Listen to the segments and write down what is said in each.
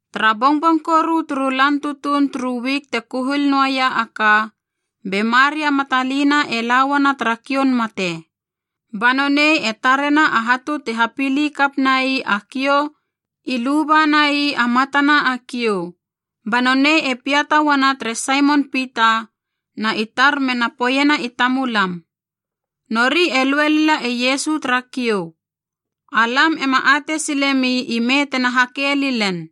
Tara bongbong koru turu lan tutuun turu wik te kuhil noaia a ka, be Maria Matalina e la uana tara kioun mate. Ba nonei e tarena a hatu ti hapili kap nai a kiou i lubana ii a matana a kiou. Ba nonei e piata uana tere Saimon Pita na i tar mena poeiena i tamulam, “Nori e lue lila e Iesu tara kiou, alam ema atei silemi ime tena hake lilen!”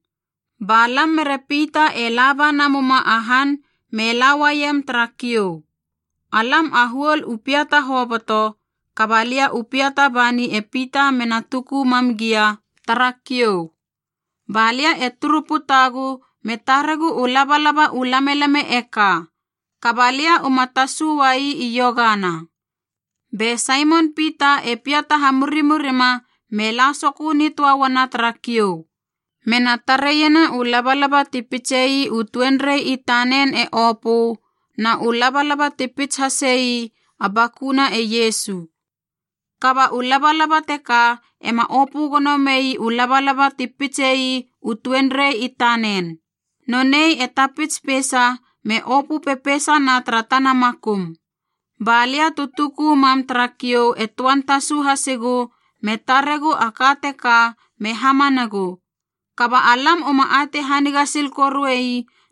Ba lam mere Pita e laba namuma a han me la uaiem tara kiou. Alam a huol u piata hoboto, kaba lia u piata bani e Pita mena tuku mam gia tara kiou. Ba lia e turu putagu me taregu u labalaba u lamelame e ka, kaba lia uma tasu uai iogana. Be Saimon Pita e piata hamurimurima me la sokö nitöa uana tara kiou, mena tareiena u labalaba ti pitsei u tuenrei i tanen e opö na u labalaba ti pits hahise ii a bakuna e Iesu. Kaba u labalaba teka ema opö gono mei u labalaba ti pitse ii u tuenrei i tanen. Nonei e tapits peisa me opö pepeisana tara tana makum. Ba lia tu tuku mam tara kiou e töan tasu hasigu me taregu a ka teka me hamanagu. Kaba alam uma atei haniga sil koru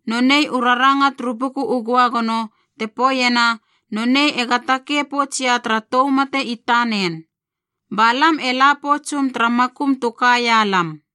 noei u raranga turu Buku u Göagono te poeiena nonei ega takei poutsia tara tou mate i tanen. Ba lam e la poutsum tara makum tu kaia lam.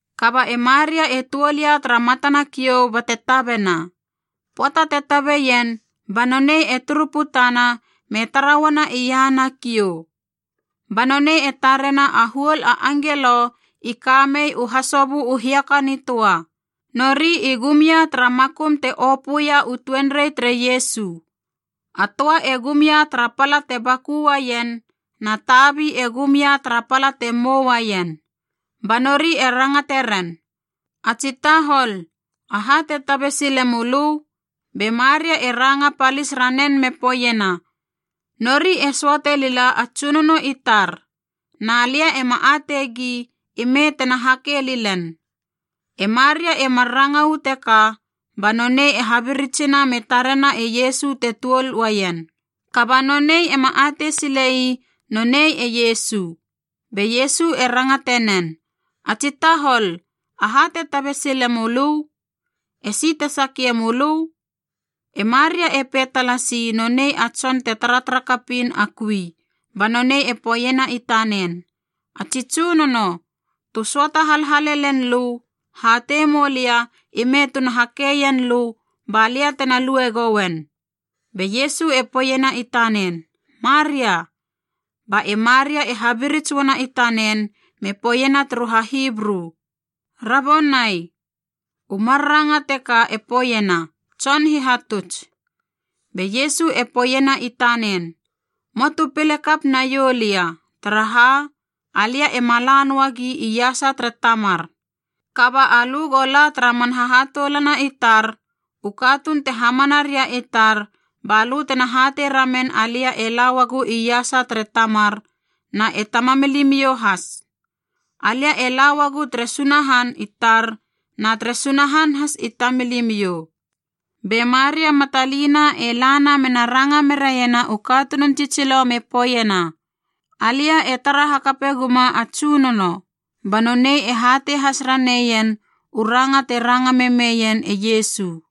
Kaba ae Maria e tuol ia tara matana kiou bate tabena. Pöata te tabeien ba nonei e turu putana me tara uana iahana kiou. Ba nonei e tarena a huol a angelo i ka mei u hasobö u hiaka nitöa, nori i gum ia tara makum te opöia u tuenrei tere Iesu, a töa e gum ia tara pala te baku uaien na tabi e gum ia tara pala te mou uaien. Ba nori e rangate ren, “A tsi tahol, aha te tabe sile mölö?” Be Maria e ranga palis ranen me poeiena, “Nori e söate lila a Tsunono i tar, na lia ema ateigi ime tena na hake lilen!” E Maria e mar ranga uu teka ba nonei e habiritsina me tarena e Iesu te tuol uaien, kaba nonei ema atei silei nonei e Iesu. Be Iesu e rangate nen, “A tsi tahol, aha te tabe sile mölö? Esi te sakie mölö?” E Maria e pei talasi nonei a tson te taratara kapiin a kui, ba nonei e poeiena i tanen, “A tsi tsunono, tu söata halhale len lö, hatei mou lia ime tuna hakeien lö ba lia tena lue gouen.” Be Iesu e poeiena i tanen, “Maria!” Ba e Maria e habirits uana i tanen me poeiena turu HaHibru, “Rabonai!” U mar ranga teka e poeiena, “Tson Hihatuts.” Be Iesu e poeiena i tanen, “Möa tu pile kap naiou lia, taraha alia ema la noa gi iasa tere Tamar. Kaba alö go la tara man hahatoulana i tar, u katuun te hamana ria i tar, balö tena hatei ramen alia e la uagu iasa tere Tamar na e Tamamilimiou has. Alia e la uagu tere Sunahan i tar na tere Sunahan has i tamilimiou.” Be Maria Matalina e lana mena ranga meraiena u katunun tsitsilo me poeiena, “Alia e tara hakape guma a Tsunono!” Ba nonei e hatei has raneien u ranga te ranga memeien e Iesu.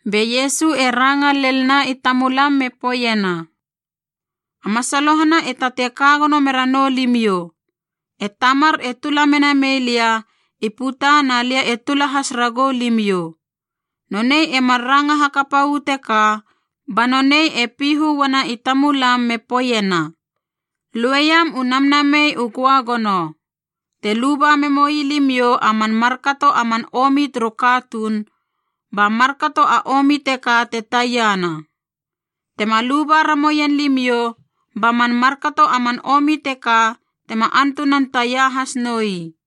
Be Iesu e ranga lelna i tamulam me poeiena, “A masalohana e tatei ka gono mera noulimiou. E Tamar e tula mena mei lia i puta na lia te tula has ragou limiou.” Nonei e mar ranga hakapa uu teka ba nonei e pihu uana i tamulam me poeiena, “Lueiam u Namnamei u Göagono. Te luba memoi limiou a man markato a man omi turu katuun, ba markato a omi teka te taiana. Tema luba ramoien limiou ba man markato a man omi teka tema antunan taia has noi.”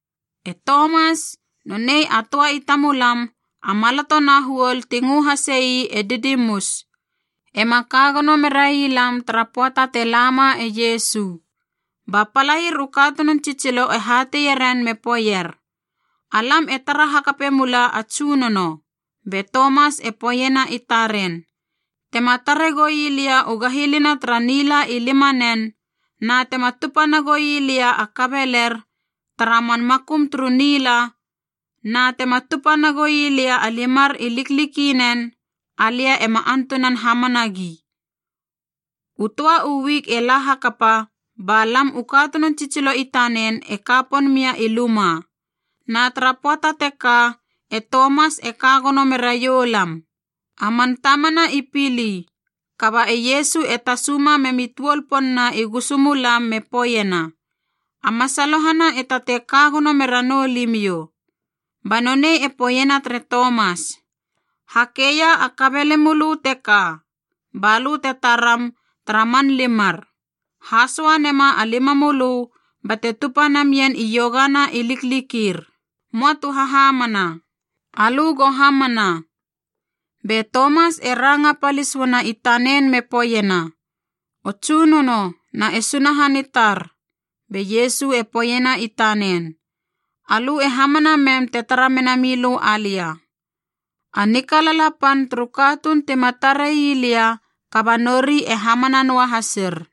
E Tomas, nonei a töa i tamulam a maloto na huol ti ngö hasei “e Didimus,” ema ka gono merai lam tara pöata te lama e Iesu. Ba palair u katunun tsitsilo e hateie ren me poeier, “Alam e tara hakape mula a Tsunono.” Be Tomas e poeiena i taren, “Tema tare goi lia u gahilina tara nila i limanen, na tema tupa nagoi lia a kabeler tara man makum turu nila, na tema tupa nagoi lia a limar i liklikinen, alia ema antunan hamana gi.” U töa u wik e la hakapa, ba lam u katunun tsitsilo i tanen e ka pon mia i luma, na tara pöata teka e Tomas e ka gono meraiou lam. A man tamana i pili,b kaba e Iesu e tasuma memi tuol pon na i gusu mulam me poeiena, “A masalohana e tatei ka gono mera noulimiou.” Ba nonei e poeiena tere Tomas, “Hakeia a kabelemölö teka, balö te taram tara man limar, hasoa nema a limamölö bate tupa namen iogana i liklikir. Möa tu hahamana, alö go hamana.” Be Tomas e ranga palis uana i tanen me poeiena, “O Tsunono na e Sunahan i tar!” Be Iesu e poeiena i tanen, “Alö e hamana mem te tara mena milö alia. A nikalala pan turu katuun tima tarei lia kaba nori e hamana noa hasir.”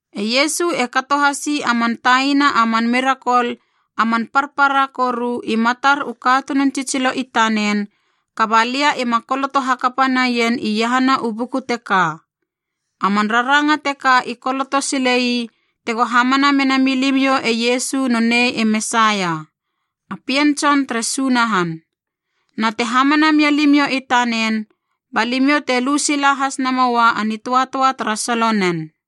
E Iesu e kato hasi a man taina a man mirakol a man parpara koru i matar u katunun tsitsilo i tanen kaba lia ima koloto hakapa naien iahana u buku teka. A man raranga teka i koloto sile ii tego hamana mena milimiou e Iesu nonei e Mesaia, a Pien Tson tere Sunahan. Na te hamana mia limiou i tanen ba limiou te lu sila has namoua a nitöatöa tara solo nen.